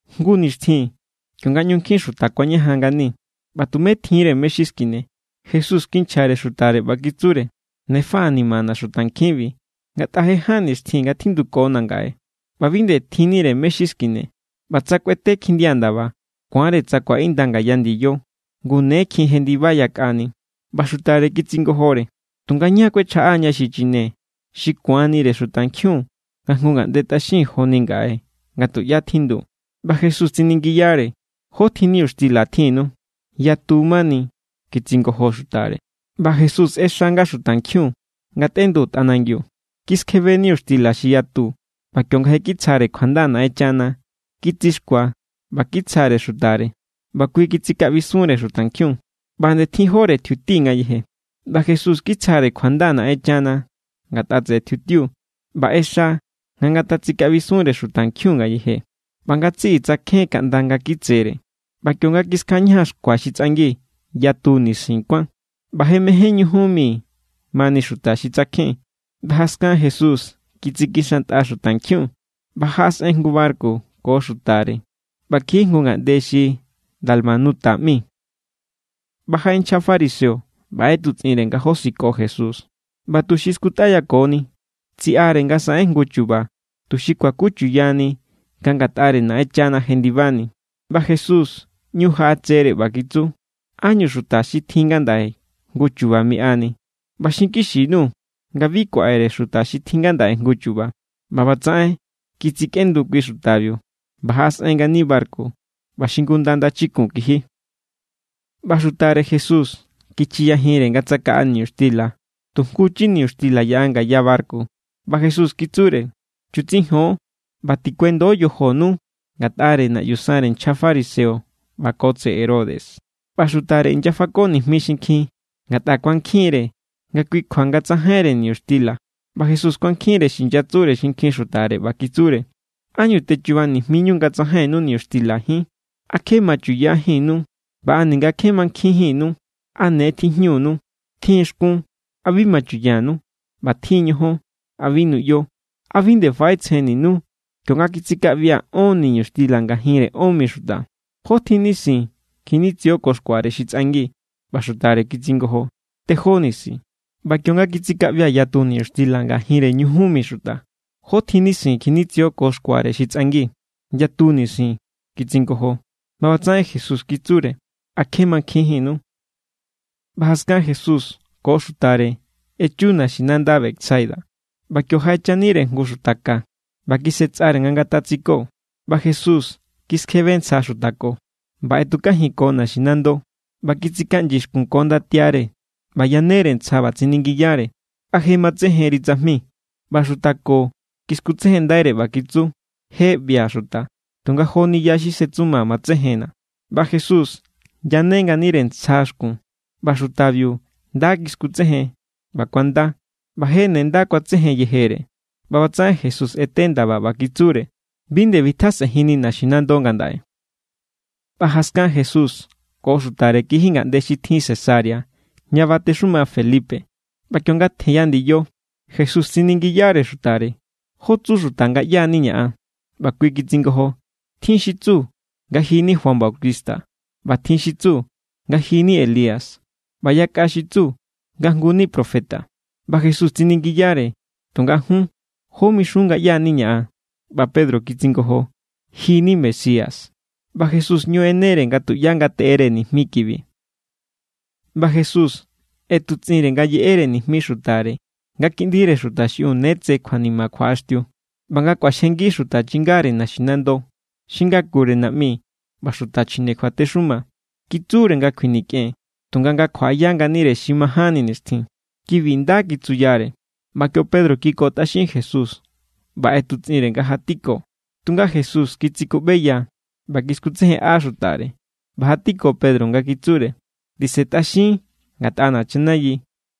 Jngu nixtjin kionga ꞌñu nkjin xuta kuañajan ngani ꞌba tumé tjinre mé= xi skine, Jesús kinchjare xutare ꞌba kitsure: —Ne faꞌanimana̱ xutankjinbi, ngatꞌa je ján nixtjin nga tjindukona̱ ngaꞌe ꞌba bi nde tjinnire mé= xi skine. ꞌBa tsa kꞌuete kjindia ndaba, ku̱anre tsa ku̱aꞌinda ngaya ndiyo, ngu ne kjin jendiba yakꞌani. ꞌBa xutare kitsingojore: —¿Tunga ñá kuechjaꞌaña xi chine xi ku̱anire xutankjiun nga jngu ngaꞌnde tꞌaxin joni ngaꞌe nga tuꞌyá tjindu? ꞌBa Jesús tsiningiyare: —¿Jótjin niñuxtila tjinnu? —Yatu mani —kitsingojo xutare. ꞌBa Jesús ꞌexa nga xutankjiun ngatꞌendu tꞌa nangiu. Kiskjebe niñuxtila xi yatu ꞌba kionga je kitsjare kjuanda Naꞌenchana, kitsixkua ꞌba kitsjare xutare, ꞌba kui kitsikaꞌbisunre xutankjiun. ꞌBa nde tjinjóre tjiuti ngayeje. ꞌBa Jesús kitsjare kjuanda Naꞌenchana ngatꞌa tseꞌe tjiutiu, ꞌba ꞌexa nga ngatatsikaꞌbisunre xutankjiun ngayeje. ꞌBa ngatsiꞌi tsakjen kaꞌnda nga kitsere, ꞌba kionga kiskjaꞌañajan xkua xi tsꞌangi, yatu nisin kuán. ꞌBa je mején ñujun mi mani xuta xi tsakjen. ꞌBa jaskan Jesús kitsikixantꞌa xutankjiun ꞌba jaꞌasꞌen jngu barku ko xutare ꞌba kiji jngu ngaꞌnde xi Dalmanuta ꞌmi. ꞌBa jaꞌe nchja fariseo ꞌba ꞌetutsꞌinre nga josiko Jesús. ꞌBa tuxi skutꞌayakoni, tsiꞌare nga saꞌen jngu chu̱ba̱ tuxi kuakuchuyani nga ngatꞌare Naꞌenchana jendibani. ꞌBa Jesús ꞌñu jaꞌatsere ꞌba kitsu: —¿Ánñu xuta xi tjin ngandaꞌe jngu chu̱ba̱ miꞌani? ꞌBa xinkixi_nuu̱ nga bi kuaꞌere xuta xi tjin ngandaꞌe jngu chu̱ba̱. ꞌBa ꞌbatsaꞌen kitsikꞌendu kui xutabiu, ꞌba jaꞌasꞌen ngani barku ꞌba xingunda ndachikun kiji. ꞌBa xutare Jesús kichiyajinre nga tsakaꞌa niñuxtila; tu jnguchi niñuxtila yaꞌa ngaya barku. ꞌBa Jesús kitsure: —Chutsijon, ꞌba tikuendo yojonu ngatꞌare naꞌyu sanre nchja fariseo ꞌba ko tseꞌe Herodes. ꞌBa xutare inyafako nijmi xinkjin ngatꞌa kuankjinre nga kui kjua nga tsajainre niñuxtila. ꞌBa Jesús kuankjinre xi inyatsure xinkjin xutare, ꞌba kitsure: —¿Ánñu techuba nijmiñu nga tsajainnu niñuxtilajín? ¿A kje machuꞌyajínnu ꞌba a ninga kje mankjinjínnu? ¿A ne tijñunu? Tjin= xkún. ¿A bi machuꞌyanu? ꞌBa tjin= ñojón. ¿A bi nuꞌyo? ¿A bi nde faꞌetsjenninu? Kionga kitsikaꞌbia̱ ón niñuxtila ngajinre ón mi xuta, ¿jótjin nisin kjinitsio ko xkuare xi tsꞌangi? ꞌBa xutare kitsingojo: —Tejó nisin. —ꞌBa kionga kitsikaꞌbia̱ yatu niñuxtila ngajinre ñujun mi xuta, ¿jótjin nisin kjinitsio ko xkuare xi tsꞌangi? —Yatu nisin —kitsingojo. ꞌBa ꞌbatsaꞌen Jesús kitsure: —¿A kje mankjinjínnu? ꞌBa jaskan Jesús ko xutare echu naxinanda Betsaida; ꞌba kio jaꞌechanire jngu xuta ka, ꞌba kisꞌetsꞌare nga ngatatsiko. ꞌBa Jesús kiskjebe ntsja xuta ko, ꞌba ꞌetukajinko naxinando. ꞌBa kitsikaꞌnyi xkun ko ndatiare ꞌba yanere ntsja ꞌba tsiningiyare: —¿A je matsejenri tsajmi? ꞌBa xuta ko kiskutsejenndaire, ꞌba kitsu: —Je ꞌbia̱ xuta, tunga joni ya xi setsuma matsejenna̱. ꞌBa Jesús yane nganire ntsja xkun, ꞌba xutabiu nda kiskutsejen, ꞌba kuanda, ꞌba je ne nda kuatsejen yejere. ꞌBa ꞌbatsaꞌen Jesús ꞌete ndaba, ꞌba kitsure: —Bi nde bitjasꞌenjinni naxinando ngandaꞌe. ꞌBa jaskan Jesús ko xutare kiji ngaꞌnde xi tjin Cesarea ña batexuma Felipe. ꞌBa kionga tjenya ndiyo, Jesús tsiningiyare xutare: —¿Jó tsu xuta nga ꞌyá=niña̱ an? ꞌBa kui kitsingojo: —Tjin xi tsu nga ji= ni Juan Bautista, ꞌba tjin xi tsu nga ji= ni Elías, ꞌba yakꞌa xi tsu nga jngu ni profeta. ꞌBa Jesús tsiningiyare: —Tunga jun, ¿jó mixun nga ꞌyá=niña̱ an? ꞌBa Pedro kitsingojo: —Ji= ni Mesías. ꞌBa Jesús ꞌñu ꞌenere nga tuꞌyá ngateꞌere nijmi kibi. ꞌBa Jesús ꞌetutsꞌinre nga yeꞌere nijmi xutare nga Kiꞌndire Xuta xiꞌiun ne tse kjuanima kjuaꞌaxtiu, ꞌba nga kꞌuaxjengi xuta chingare naxinando, xi ngakure naꞌmi ꞌba xuta chjine kjuatexuma. Kitsure nga kjuinikꞌen, tunga nga kjuaꞌaya nganire xi majánni nixtjin. Kibi nda kitsuyare. ꞌBa kio Pedro kikotꞌaxin Jesús ꞌba ꞌetutsꞌinre nga jatiko. Tunga Jesús kitsikuꞌbeya ꞌba kiskutsejenꞌa xutare, ꞌba jatiko Pedro nga kitsure: —¡Tisentꞌaxin ngatꞌana̱ chanayi!,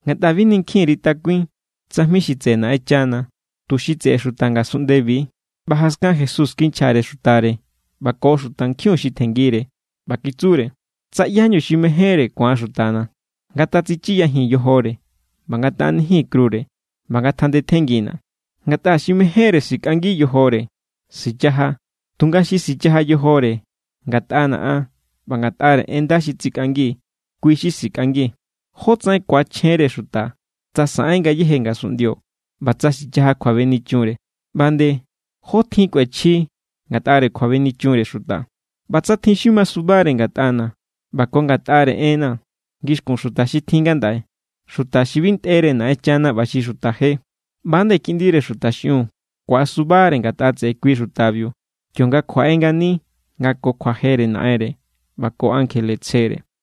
ngatꞌa bi ninkjin_ri takuin tsajmi xi tseꞌe Naꞌenchana, tu xi tseꞌe xuta ngasunꞌndebi=. ꞌBa jaskan Jesús kinchjare xutare ꞌba ko xutankjiun xi tjenngire, ꞌba kitsure: —Tsa ꞌyáñu xi mejénre ku̱an xutana̱, ngatatsichiyajin yojore ꞌba ngataꞌanijin krure ꞌba ngatjandetjenngina̱. Ngatꞌa xi mejénre sikꞌangi yojore, sichaja; tunga xi sichaja yojore ngatꞌana̱ an ꞌba ngatꞌare en nda xi tsikꞌangi, kui= xi sikꞌangi. ¿Jótsaꞌen ku̱achjenre xuta tsa saꞌen ngayéje ngasunꞌndio ꞌba tsa sichaja kjuabenichunre? ꞌBa nde ¿jótjin kꞌuechji ngatꞌare kjuabenichunre xuta? ꞌBa tsa tjin xi masubare ngatꞌana̱ ꞌba ko ngatꞌare enna̱ ngixkun xuta xi tjin ngandaꞌe, xuta xi bi ntꞌere Naꞌenchana ꞌba xi xuta je, ꞌba=nde Kiꞌndire Xuta xiꞌiun ku̱asubare ngatꞌa tseꞌe kui xutabiu kionga kjuaꞌe ngani nga ko kjuajere Naꞌenre ꞌba ko ankjele tsjere.